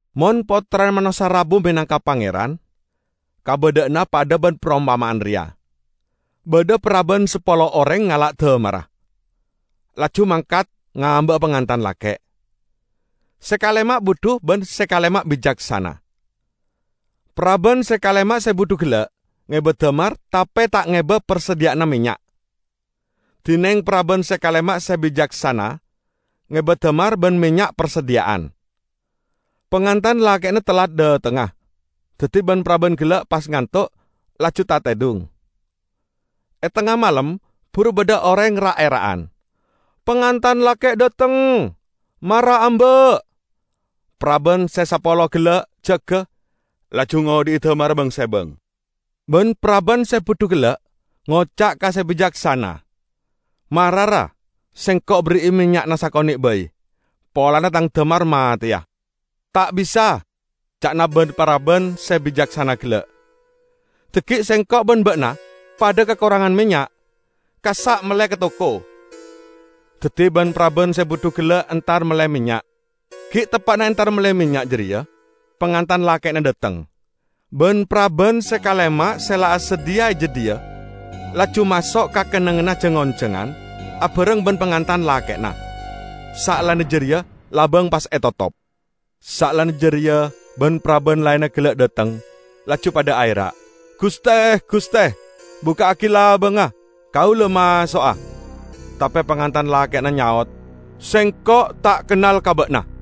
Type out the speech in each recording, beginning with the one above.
"Mon Pottrana Manossa rabu menangka Pangeran, kabadha'anna padha ban parompama'an reya: Badha paraban sapolo oreng ngala' damarra, laju mangkat ngamba'a pangantan lake'. Se kalema budhu ban se kalema bicaksana. Paraban se kalema se budhu gella' ngeba damar, tape ta' ngeba parsadhiya'anna mennya'. Dineng paraban se kalema se bicaksana ngeba damar ban mennya' parsadhiya'an. Pangantan lake'na tellat dhatengnga, daddi ban-paraban gella' pas ngantok, laju tatedhung. E tengnga malem buru badha oreng ra'-era'an, 'Pangantan lake' dhateng! Mara amba'!' Paraban se sapolo gella' jaga, laju ngodhi'i damarra bang-sebang. Ban-paraban se budhu gella' ngoca' ka se bicaksana, 'Mara, ra, sengko' berri'i mennya'na sakone' bai, polana tang damar mateya.' 'Ta' bisa!' ca'na ban-paraban se bicaksana gella', 'dhaggi' sengko' ban ba'na padha kakorangan mennya'. Kassa' melle ka toko.' Daddi ban-paraban se budhu gella' entar melle mennya'. Gi' teppa'na entar melle mennya' jareya, pangantan lake'na dhateng. Ban-paraban se kalema se la asadhiya e jadhiya laju maso' ka kennengnganna jang-onjangan abareng ban pangantan lake'na, saellana jareya labang pas etotop! Saellana jareya ban-paraban laenna gella' dhateng, laju padha aera', 'Guste! Guste! bukka'agi labangnga, kaula maso'a.' Tape pangantan lake'na nyaot, 'Sengko' ta' kennal ka ba'na!' "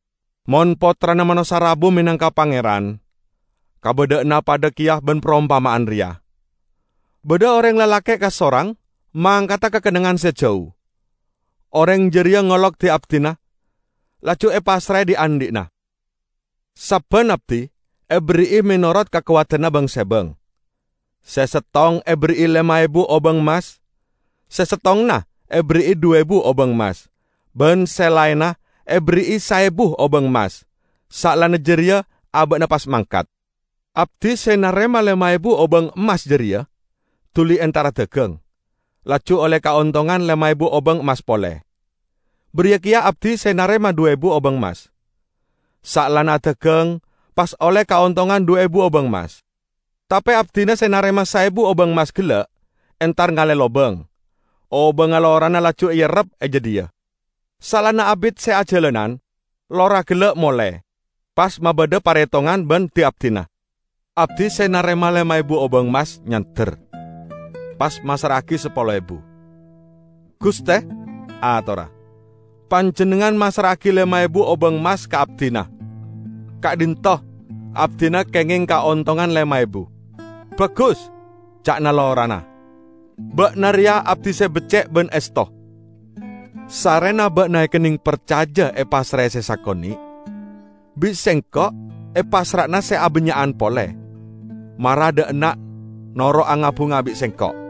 "Mon Pottrana Manossa rabu menangka Pangeran, kabadha'anna padha keya ban parompama'an reya. Badha oreng lalake' kasorang mangkada ka kennengngan se jau. Oreng jareya ngolok di-abdina, laju epassrae dhi'-andhi'na. Sabban abdi eberri'i menorot kakowadanna bang-sebang. Se settong eberri'i lema ebu obang emmas. Se settonganna eberri'i dhu ebu obang emmas. Ban se laenna eberri'i saebu obang emmas. Saellana jareya aba'na pas mangkat. Abdi se narema lema ebu obang emmas jareya duli entar adagang, laju olle kaontongan lema ebu obang emmas pole. Bariya keya abdi se narema dhu ebu obang emmas, saellana adagang pas olle kaontongan dhu ebu obang emmas. Tape abdina se narema saebu obang emmas gella' entar ngale lobang, obangnga lorana laju eerrep e jadhiya. Saellana abit se ajalanan, lora gella' mole, pas mabadha paretongan ban di-abdina. Abdi se narema lema ebu obang emmas nyander, pas massra'agi sapolo ebu. 'Guste,' atorra, 'Panjennengngan massra'agi lema ebu obang emmas ka abdina. Ka'dhinto', abdina kengeng kaontongan lema ebu.' 'Bagus!' ca'na lorana, 'ba'na reya abdi se becce' ban esto. Sarrena ba'na ekenneng parcaja epassrae se sakone', bi' sengko' epassra'ana se abannya'an pole. Mara dha' enna' noro' anga-bunga bi' sengko'!'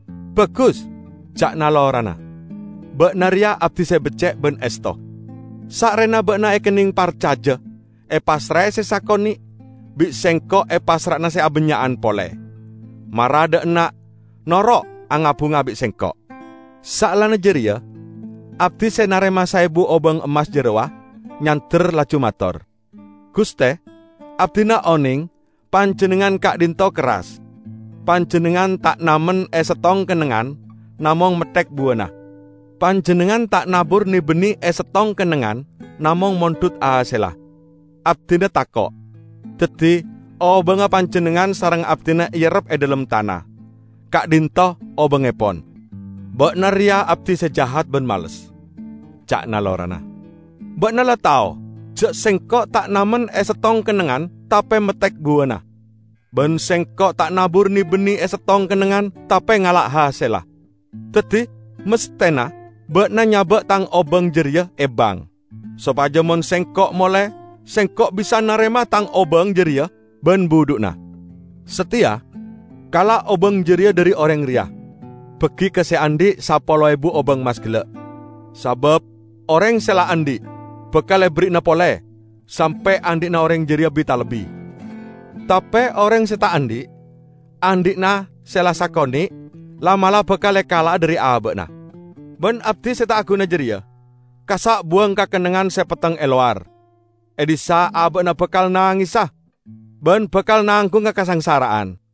'Bagus,' ca'na lorana, 'ba'na reya abdi se becce' ban esto. Sarrena ba'na ekenneng parcaja epassrae se sakone' bi' sengko' epassra'ana se abannya'an pole. Mara dha' enna', noro' anga-bunga bi' sengko'!' Saellana jareya abdi se narema saebu obang emmas jarowa nyander, laju mator, 'Guste, abdina oneng panjennengngan ka'dhinto' kerras. Panjennengngan ta' namen e settong kennengngan namong metthek buwana, panjennengngan ta' nabur ne-bine e settong kennengngan namong mondhut hasella. Abdina tako', daddi obangnga panjennengngan sareng abdina eerrep e dhalem tana. Ka'dhinto' obangngepon.' 'Ba'na reya abdi se jahat ban males!' ca'na lorana. 'Ba'na la tao ja' sengko' ta' namen e settong kennengngan tape metthek buwana, ban sengko' ta' nabur ne-bine e settong kennengngan tape ngala' hasella. Daddi masthena, ba'na nyaba' tang obang jareya e bank, sopaja mon sengko' mole, sengko' bisa narema tang obang jareya ban budhu'na. Sateya, kala' obang jareya dhari oreng reya, bagi ka se andhi' sapolo ebu obang emmas gella'. Sabab oreng se la andhi', bakal eberri'ana pole, sampe' andhi'na oreng jareya bi-talebbi. Tape oreng se ta' andhi', andhi'na se la sakone' la'-mala' bakal ekala'a dhari aba'na. Ban abdi se ta' aguna jareya, kassa' buwang ka kennengngan se petteng e lowar. E dhissa' aba'na bakal nangesa ban bakal nanggunga kasangsara'an!' "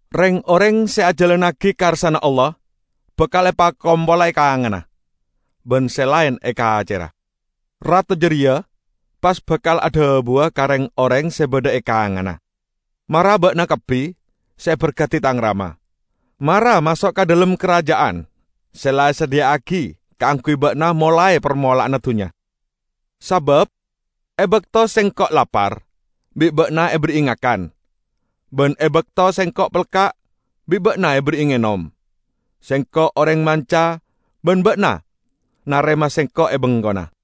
Reng-oreng se ajalannagi karsana Allah bakal epakompola e kanganna, ban se laen e kacerra. Rato jareya pas bakal adhabuwa ka reng-oreng se badha e kanganna, 'Mara ba'na kabbi se eberkadi Tang Rama. Mara maso' ka dhalem Karaja'an se la esadhiya'agi kaangguy ba'na molae parmola'anna dunnya. Sabab e bakto Sengko' lapar, bi' ba'na eberri'i ngakan, ban e bakto Sengko' pelka', bi' ba'na eberri'i ngenom. Sengko' oreng manca ban ba'na narema Sengko' e bengkona.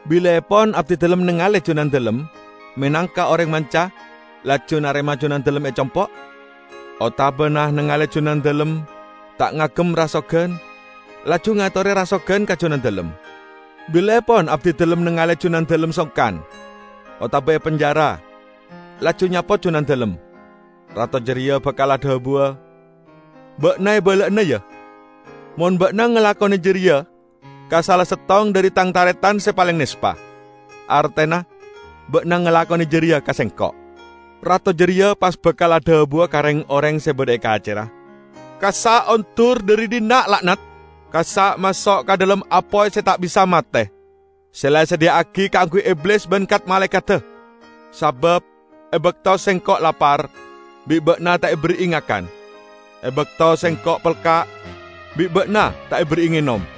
Bilaepon abdidalem nengale Junandalem menangka oreng manca, laju narema Junandalem e compo'? Otabana nengale Junandalem ta' ngagem rasogan laju ngatore rasogan ka Junandalem? Bilaepon abdidalem nengale Junandalem songkan otaba epenjara laju nyapot Junandalem?' Rato jareya bakal adhabuwa, 'Ba'na, ebala'ana ya: mon ba'na ngalakone jareya ka sala settong dhari Tang taretan se paleng nespa, artena ba'na ngalakone jareya ka Sengko'!' Rato jareya pas bakal adhabuwa ka reng-oreng se badha e kacerra, 'Kassa' ondur dhari dhinna', la'nat! Kassa' maso' ka dhalem apoy se ta' bisa mate se la esadhiya'agi kaangguy Iblis ban kat-malaekadda! Sabab e bakto Sengko' lapar bi' ba'na ta' eberri'i ngakan; e bakto Sengko' pelka' bi' ba'na ta' eberri'i ngenom.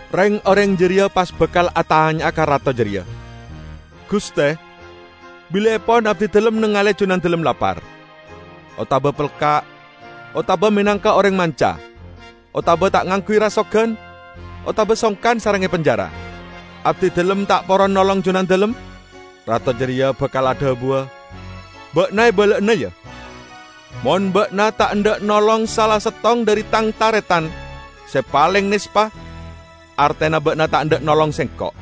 Reng-oreng jareya pas bakal atanya'a ka rato jareya, 'Guste, bilaepon abdidalem nengale Junandalem lapar, otaba pelka', otaba menangka oreng manca, otaba ta' ngangguy rasogan otaba songkan sareng epenjara, abdidalem ta' poron nolong Junandalem?' Rato jareya bakal adhabuwa, 'Ba'na, ebala'ana ya: mon ba'na ta' endha' nolong sala settong dhari Tang taretan se paleng nespa, artena ba'na ta' endha' nolong Sengko'.'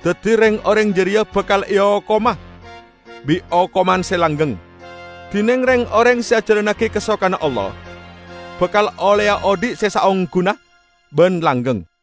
Daddi reng-oreng jareya bakal eokoma bi' okoman se langgeng, dineng reng-oreng se ajalannagi kasokanna Allah bakal olleya odhi' se saongguna ban langgeng."